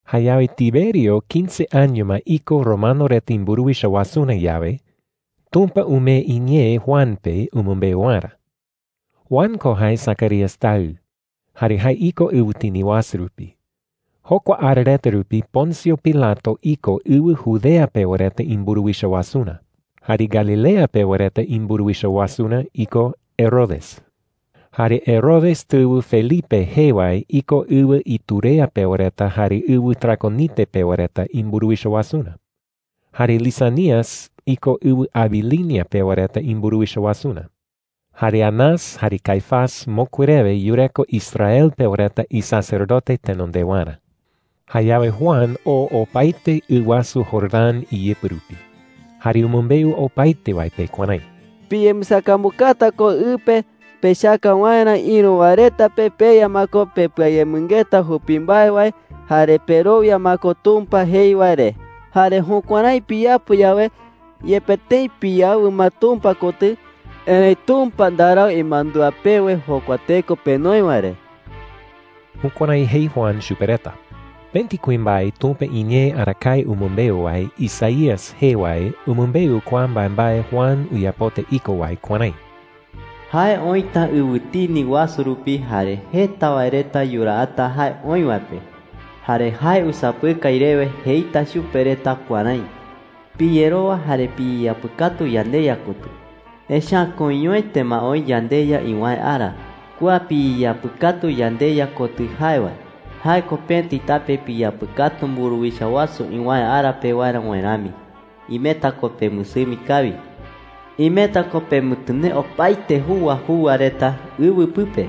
Jayawe Tiberio quince año ma iko romano reta imburuwicha wasurä yawe, Tumpa umee iñee Juan pe umɨmbeu waerä. Juan ko jae Zacarías taɨ, jare jae iko ɨwɨtini wasu rupi. Jokua ara reta rupi Poncio Pilato iko ɨwɨ Judea pewa reta imburuwicha wasurä. Jare Galilea pewa reta imburuwicha wasurä iko Herodes. Jare Herodes tɨwɨ Felipe jee wae iko ɨwɨ Iturea pewa reta jare ɨwɨ Traconite pewa reta imburuwicha wasurä. Jare Lisanias iko ɨwɨ Abilinia pewa reta imburuwicha wasurä. Jare Anás jare Caifás mokui rewe yureko Israel pewa reta isacerdote tenondewarä. Jayawe Juan oo opaete ɨ wasu Jordán iyɨpɨ rupi. Jare umɨmbeu opaete wae pe kuärái: “Piyembɨsakambukata ko ɨ pe pechaka waerä ïru wae reta pe peya ma ko pepɨayemɨngeta jupi mbae wae jare perowia ma ko Tumpa jei wae re. Jare jukuärái piyapo yawe, yepe tëi piyawɨ ma Tumpa kotɨ, erëi Tumpa ndarau imandúa pewe jokua teko penoi wae re.” Jukuärái jei Juan chupe reta. Pëti kuimbae Tumpa iñee arakae umɨmbeu wae Isaías jee wae umɨmbeu kua mbaembae Juan uyapota iko wae kuärái: “Jae oïta ɨwɨtini wasu rupi, jare jeta wae reta yuraata jae oï wae pe. Jare jae usapɨkai rewe jeita chupe reta kuärái: ‘Piyerowa jare piyeyapɨkatu yandeYa kotɨ, echa’ä koiñoete ma oï yandeYa iwäe ara. Kua piyeyapɨkatu yandeYa kotɨ jae wae, jae ko pëti tape piyapɨkatu mburuwicha wasu iwäe ara pewarä wae rami. Imeta ko pemɨsɨmi kawi. Imeta ko pemɨtɨnee opaete juwa juwa reta ɨwɨ pɨpe.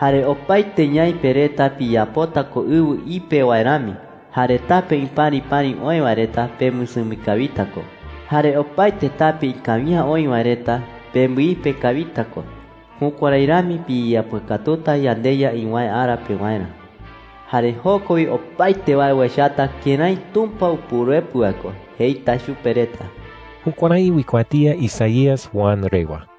Jare opaete ñaipe reta piyapota ko ɨwɨ ipe wae rami. Jare tape ipäripäri oï wae reta, pemɨsɨmi kawita ko. Jare opaete tape ikawi’ä oï wae reta, pembɨipe kawita ko. Jukuärái rami piyeyapɨkatuta yandeYa iwäe ara pewarä. Jare joko wi opaete wae uechata kërái Tumpa Upuruepɨ wae ko,’ jeita chupe reta.” Jukuärái uikuatía Isaías Juan rewa.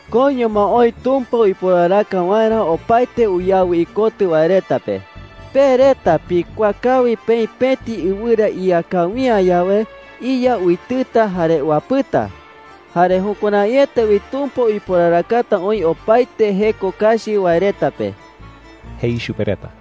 “Koiño ma oï Tumpa uiporaraka waerä opaete uyawɨ ikotɨ wae reta pe. Pe reta pikuaa kawi peï pëti ɨwɨra ía kawi’ä yawe, iya uitɨta jare uapɨta. Jare jukuäraiete wi Tumpa uiporarakata oï opaete jeko kachi wae reta pe,” jei chupe reta.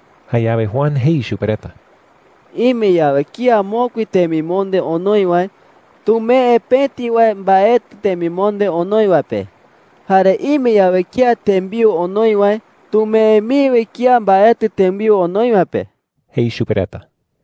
Jayawe Juan jei chupe reta: “Ime yawe kía mokui temimonde onoi wae, tumee pëti wae mbaetɨ temimonde onoi wae pe. Jare ime yawe kía tembiu onoi wae, tumee mii wi kía mbaetɨ tembiu onoi wae pe,” jei chupe reta.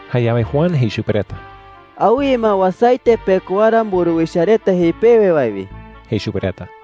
Jayawe Juan jei chupe reta: “Awɨye ma uasaete pekowara mburuwicha reta jei pewe wae wi,” jei chupe reta.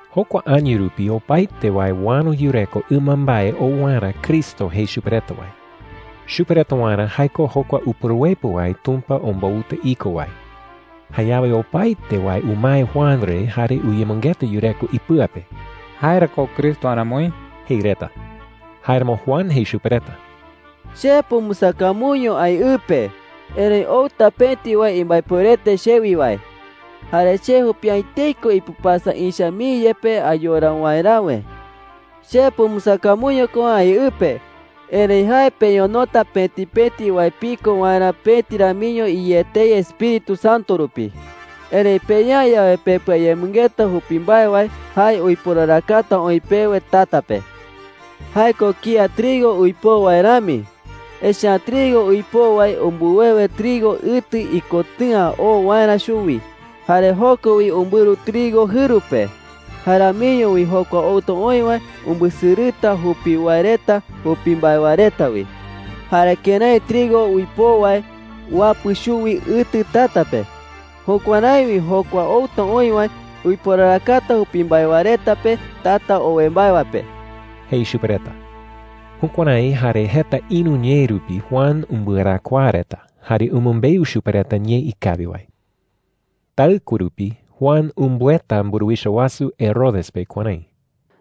Jokua año rupi opaete wae uäro yureko ɨmambae ou waerä Cristo jei chupe reta wae. Chupe reta waerä jae ko jokua Upuruepɨ wae Tumpa ombouta iko wae. Jayawe opaete wae umae Juan re jare uyemɨngeta yureko ipɨa pe: “¿Jae ra ko Cristo aramoi?” jei reta. Jáeramo Juan jei chupe reta: “Che pumbɨsakambuño aï ɨ pe. Erëi outa pëti wae imbaepuerete chewi wae. Jare che jupi’ä etei ko ipɨpasa ïcha mii yepe ayora waeräwe,” jei. “Che pumbɨsakambuño ko aï ɨ pe, erëi jae peñonota pëti pëti wae piko waerä pëti ramiño iyé etei Espíritu Santo rupi. Erëi peya’ä yawe pepɨayemɨngeta jupi mbae wae, jae uiporarakata oï pewe tata pe,” jei chupe reta. “Jae ko kía trigo uipoo wae rami. Echa’ä trigo uipoo wae umbɨwewe trigo ɨtɨ ikotɨ̈a oo waerä chuwi, jare joko wi umbɨru trigo jɨru pe. Jae ramiño wi jokua outa oï wae umbɨsɨrɨta jupi wae reta jupi mbae wae reta wi,” jei chupe reta. “Jare kërái trigo uipoo wae uapɨ chuwi ɨtɨ tata pe, jukuärái wi jokua outa oï wae uiporarakata jupi mbae wae reta pe tata owe mbae wae pe,” jei chupe reta. Jukuärái jare jeta ïru ñee rupi Juan umbɨarakuaa reta jare umɨmbeu chupe reta ñee ikawi wae. Taɨkue rupi Juan umbɨeta mburuwicha wasu Herodes pe kuärái: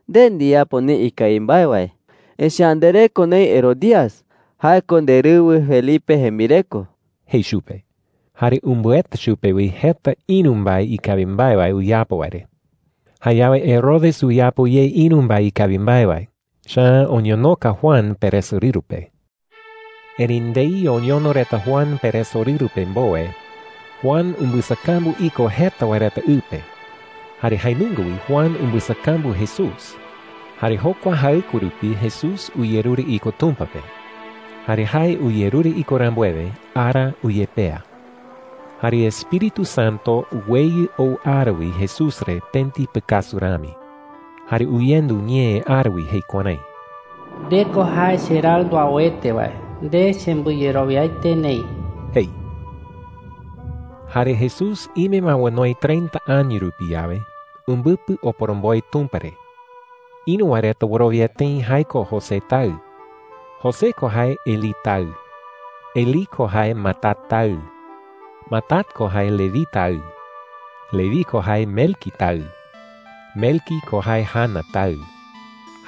“Nde ndiyapo neï ikawi mbae wae, echa’ä ndereko neï Herodías – jae ko nderɨwɨ Felipe jembireko,” jei chupe. Jare umbɨeta chupe wi jeta ïru mbae ikawi mbae wae uyapo wae re. Jayawe Herodes uyapo ye ïru mbae ikawi mbae wae, echa’ä oñonoka Juan peresorɨru pe. Erëi ndei oñono reta Juan peresorɨru pe mbowe, Juan umbɨsakambu iko jeta wae reta ɨ pe. Jare jae nunga wi Juan umbɨsakambu Jesús. Jare jokua jaɨkue rupi, Jesús uyerure iko Tumpa pe. Jare jae uyerure iko rambuewe, ara uyepea. Jare Espíritu Santo uweyɨ ou ara wi Jesús re pëti pɨkasu rami. Jare uyendu ñee ara wi jei kuärái: “Nde ko jae cheRaɨ nduauete wae. Nde chembɨyerowiaete neï,” jei. Jare Jesús ime ma onoi treinta año rupi yawe, umbɨpɨ oporomboe Tumpa re. Ïru wae reta wɨrowia tëi jae ko José taɨ. José ko jae Elí taɨ. Elí ko jae Matat taɨ. Matat ko jae Leví taɨ. Leví ko jae Melqui taɨ. Melqui ko jae Jana taɨ.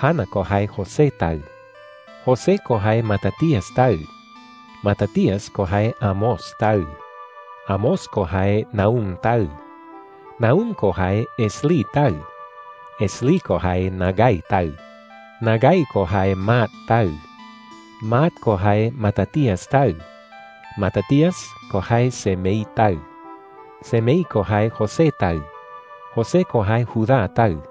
Jana ko jae José taɨ. José ko jae Matatías taɨ. Matatías ko jae Amós taɨ. Amós ko jae Nahum taɨ. Nahum ko jae Esli taɨ. Esli ko jae Nagai taɨ. Nagai ko jae Maat taɨ. Maat ko jae Matatías taɨ. Matatías ko jae Semei taɨ. Semei ko jae José taɨ. José ko jae Judá taɨ.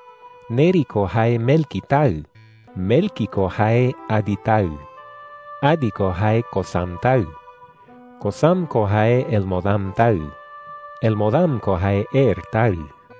Neri ko jae Melqui taɨ. Melqui ko jae Adi taɨ. Adi ko jae Cosam taɨ. Cosam ko jae Elmodam taɨ. Elmodam ko jae Er taɨ.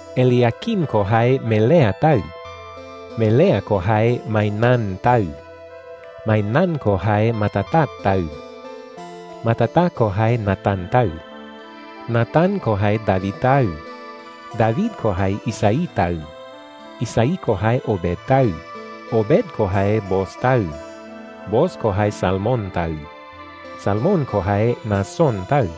Eliaquim ko jae Melea taɨ. Melea ko jae Mainán taɨ. Mainán ko jae Matata taɨ. Matata ko jae Natán taɨ. Natán ko jae David taɨ. David ko jae Isaí taɨ. Isaí ko jae Obed taɨ. Obed ko jae Booz taɨ. Booz ko jae Salmón taɨ. Salmón ko jae Naasón taɨ.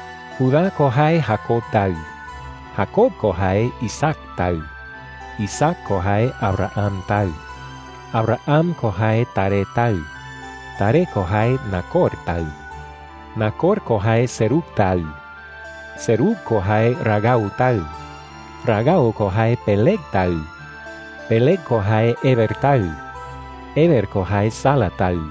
Judá ko jae Jacob taɨ. Jacob ko jae Isaac taɨ. Isaac ko jae Abraham taɨ. Abraham ko jae Taré taɨ. Taré ko jae Nacor taɨ. Nacor ko jae Serug taɨ. Serug ko jae Ragau taɨ. Ragau ko jae Peleg taɨ. Peleg ko jae Heber taɨ. Heber ko jae Sala taɨ.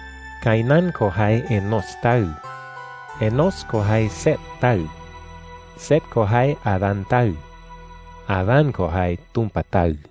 Cainán ko jae Enós taɨ. Enós ko jae Set taɨ. Set ko jae Adán taɨ. Adán ko jae Tumpa taɨ.